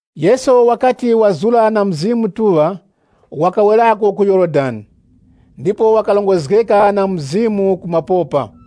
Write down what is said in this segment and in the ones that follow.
Yesu wakati wazura na Mzimu Mutuŵa, wakawerako ku Yorodani. Ndipo wakarongozgeka na Mzimu mu mapopa,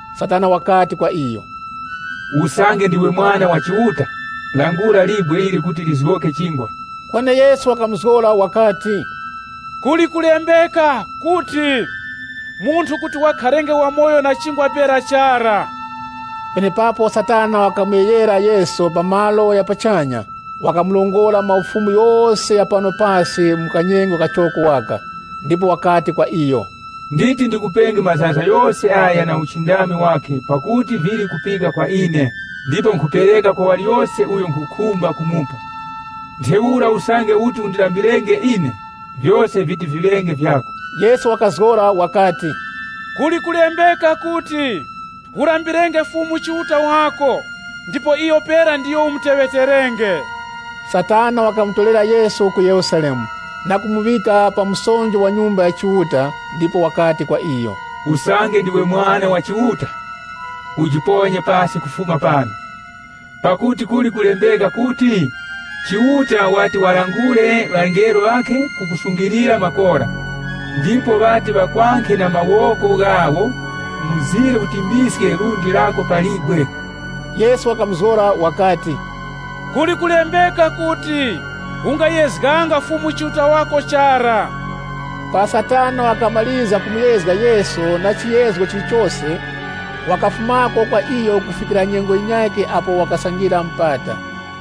Satana wakati kwa iyo, “Usange ndiwe Mwana wa Chiuta, langulira libwe ili kuti lizgoke chingwa.” Kweni Yesu wakamuzgora wakati, “Kuli kulembeka kuti, ‘Munthu kuti wakharenge wamoyo na chingwa pera chara.’” Penepapo Satana wakamuyeghera Yesu pa malo gha pachanya, wakamurongora maufumu ghose gha pano pasi mu kanyengo kachoko waka. Ndipo wakati kwa iyo, “Nditi ndikupenge mazaza ghose agha na uchindami wakhe pakuti vili kupika kwa ine. Ndipo nkhupereka kwa waliyose uyo nkhukhumba kumupa. Ntheura usange uti undilambirenge ine, vyose viti viŵenge vyako.” Yesu wakazgora wakati, “Kuli kulembeka kuti, ‘Ulambirenge Fumu Chiuta wako ndipo iyo pera ndiyo umuteŵeterenge.’” Satana wakamutorera Yesu ku Yerusalemu, na kumuŵika pa msonjo wa Nyumba ya Chiuta. Ndipo wakati kwa iyo, “Usange ndiwe Mwana wa Chiuta, ujiponye pasi kufuma pano. Pakuti kuli kulembeka kuti, ‘Chiuta wati walangure ŵangelo ŵakhe kuti ŵakusungilire makora.’ Ndiposo, ‘Iwo ŵati ŵakwankhe na mawoko ghawo mzire ujibwaske lundi lako pa libwe.’” Yesu wakamuzgora wakati, “Kuli kulembeka kuti, ‘Ungayezganga Fumu Chiuta wako.’” Para Satana wakamarizga kumuyezga Yesu na chiyezgo chilichose, wakafumako kwa iyo kufikira nyengo yinyakhe apo wakasangira mupata.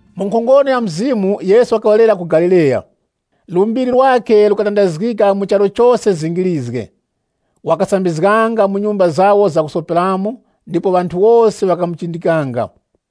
Mu nkhongono ya Mzimu, Yesu wakawerera ku Galileya. Lumbiri lwakhe lukatandazgika mu charu chose zingirizge. Wakasambizganga mu nyumba zawo zakusoperamo, ndipo ŵanthu wose ŵakamuchindikanga.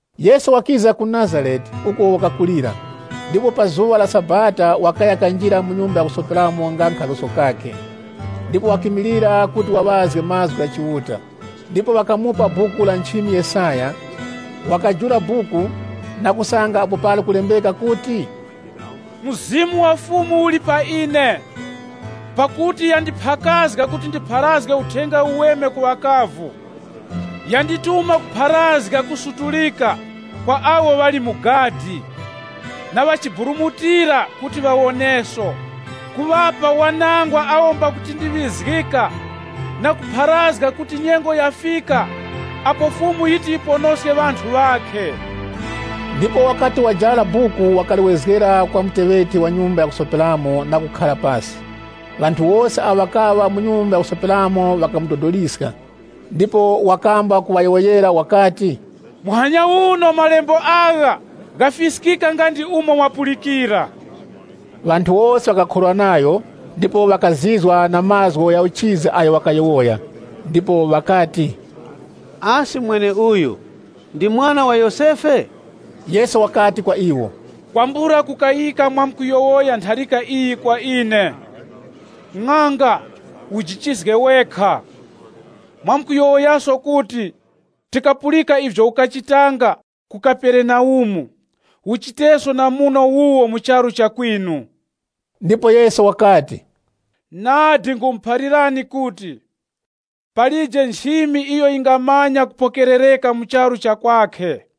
Yesu wakiza ku Nazarete, uko wakakulira. Ndipo pa zuŵa la Sabata wakaya kanjira mu nyumba ya kusoperamo nga nkhaluso kakhe. Ndipo wakimilira kuti waŵazge Mazgu gha Chiuta. Ndipo ŵakamupa Buku la nchimi Yesaya. Wakajula buku, na kusanga apo pali kulembeka kuti, “Mzimu wa Fumu wali pa ine, pakuti yandiphakazga kuti ndipharazge Uthenga Uweme ku ŵakavu. Yandituma kupharazga kusutulika, kwa awo ŵali mu gadi. Na ŵachiburumutira kuti ŵawoneso, Kuŵapa wanangwa awo mbakutindiŵizgika, (LXX) na kupharazga kuti nyengo yafika apo Fumu yiti yiponoske ŵanthu wakhe.” Ndipo wakati wajara buku, wakaliwezgera kwa muteŵeti wa nyumba ya kusoperamo na kukhara pasi. Ŵanthu wose awo ŵakaŵa mu nyumba ya kusoperamo ŵakamudodoliska. Ndipo wakamba kuŵayowoyera wakati, “Muhanya uno malembo agha, ghafiskika nga ndi umo mwapulikira.” Ŵanthu wose ŵakakhorwa nayo, ndipo ŵakazizwa na mazgu gha uchizi agho wakayowoya. Ndipo ŵakati, “Asi mweneuyu ndi mwana wa Yosefe?” Yesu wakati kwa iwo, “Kwambula kukayika mwamkuyowoya ntharika iyi kwa ine, ‘Ng'anga, ujichizge wekha!’ Mwamkuyowoyaso kuti, ‘Tikapulika ivyo ukachitanga ku Kaperenaumu, uchiteso na muno wuwo mu charu cha kwinu.’” Ndipo Yesu wakati, “Nadi nkhumuphalirani kuti, palije nchimi iyo yingamanya kupokerereka mu charu cha kwakhe.”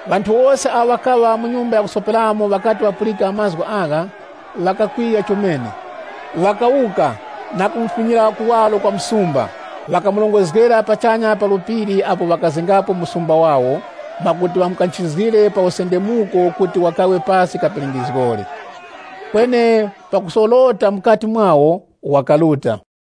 Ŵanthu wose awo ŵakaŵa mu nyumba ya kusoperamo ŵakati ŵapulika mazgu agha, ŵakakwiya chomene. Ŵakawuka, na kumufumyira kuwaro kwa msumba, ŵakamurongozgera pachanya pa phiri apo ŵakazengapo msumba wawo, mwakuti ŵamukanchizgire pa usendemuko kuti wakawe pasi kapingizgori. Kweni pakusorota mukati mwawo, wakaruta.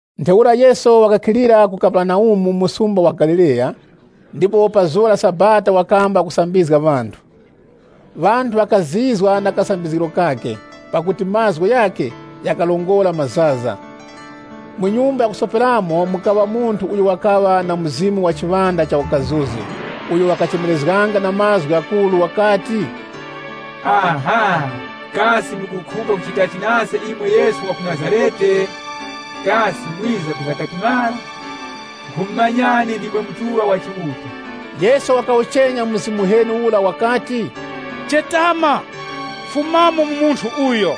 Ntheura Yesu wakakhilira ku Kaperenaumu, msumba wa Galileya, ndipo pa zuŵa la Sabata wakamba kusambizga ŵanthu. Ŵanthu ŵakazizwa na kasambizgiro kakhe, pakuti mazgu ghakhe ghakarongora mazaza. Mu nyumba ya kusoperamo, mukaŵa munthu uyo wakaŵa na mzimu uheni, uyo wakachemerezga na mazgu ghakuru wakati, “Aha! Kasi mukukhumba kuchitachi nase imwe Yesu wa ku Nazarete? Kasi mwiza kwiza katimara? Nkhumumanyani, ndimwe Mutuŵa Yura wa Chiuta!” Yesu wakawuchenya mzimu uheni ura wakati, “Chetama! Fumamo mu munthu uyo.”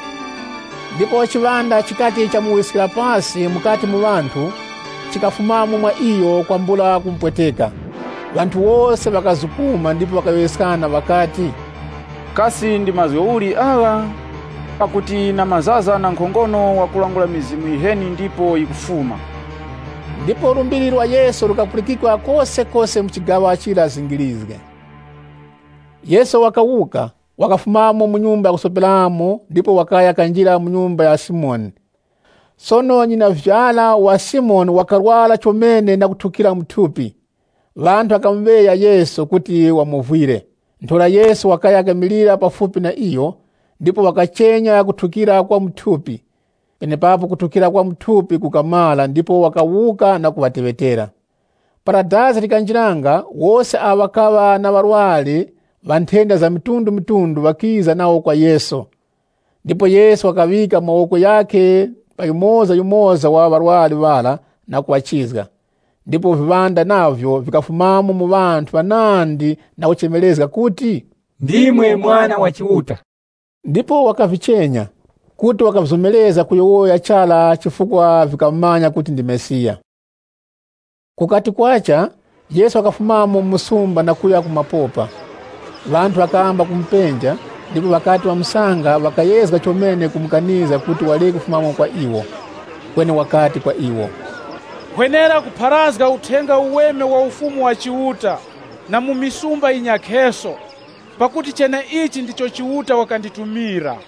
Ndipo chiŵanda chikati chamuwiskira pasi mukati mu ŵanthu, chikafumamo mwa iyo kwambula kumupweteka. Ŵanthu wose ŵakazukuma ndipo ŵakayowoyeskana ŵakati, “Kasi ndi mazgu uli agha? Pakuti na mazaza na nkhongono wakulangula mizimu yiheni ndipo yikufuma.” Ndipo lumbiri lwa Yesu lukapulikikwa kosekose mu chigaŵa chira zingirizge. Yesu wakawuka, wakafumamo mu nyumba ya kusoperamo, ndipo wakaya kanjira mu nyumba ya Simoni. Sono nyinavyara wa Simoni wakarwara chomene na kuthukira mu thupi. Ŵanthu ŵakamuŵeya Yesu kuti wamovwire. Ntheura Yesu wakaya kimilira pafupi na iyo, ndipo wakachenya kuthukira kwa mu thupi. Penepapo kuthukira kwa mu thupi kukamara ndipo wakawuka na kuŵateŵetera. Para dazi likanjiranga wose awo ŵakaŵa na ŵarwari ŵa nthenda za mitundumitundu ŵakiza nawo kwa Yesu. Ndipo Yesu wakaŵika mawoko ghakhe pa yumozayumoza wa ŵarwari ŵara na kuŵachizga. Ndipo viŵanda navyo vikafumamo mu ŵanthu ŵanandi na kuchemerezga kuti, “Ndimwe Mwana wa Chiuta.” Ndipo wakavichenya, kuti wakavizomerezga kuyowoya chara chifukwa vikamumanya kuti ndi Mesiya. Kukati kwacha, Yesu wakafumamo mu msumba na kuya ku mapopa. Ŵanthu ŵakamba kumupenja, ndipo ŵakati ŵamusanga, ŵakayezga chomene kumukanizga kuti wareke kufumako kwa iwo. Kweni wakati kwa iwo, “Nkhwenera kupharazga Uthenga Uweme wa Ufumu wa Chiuta na mu misumba yinyakheso, pakuti cheneichi ndicho Chiuta wakanditumira.”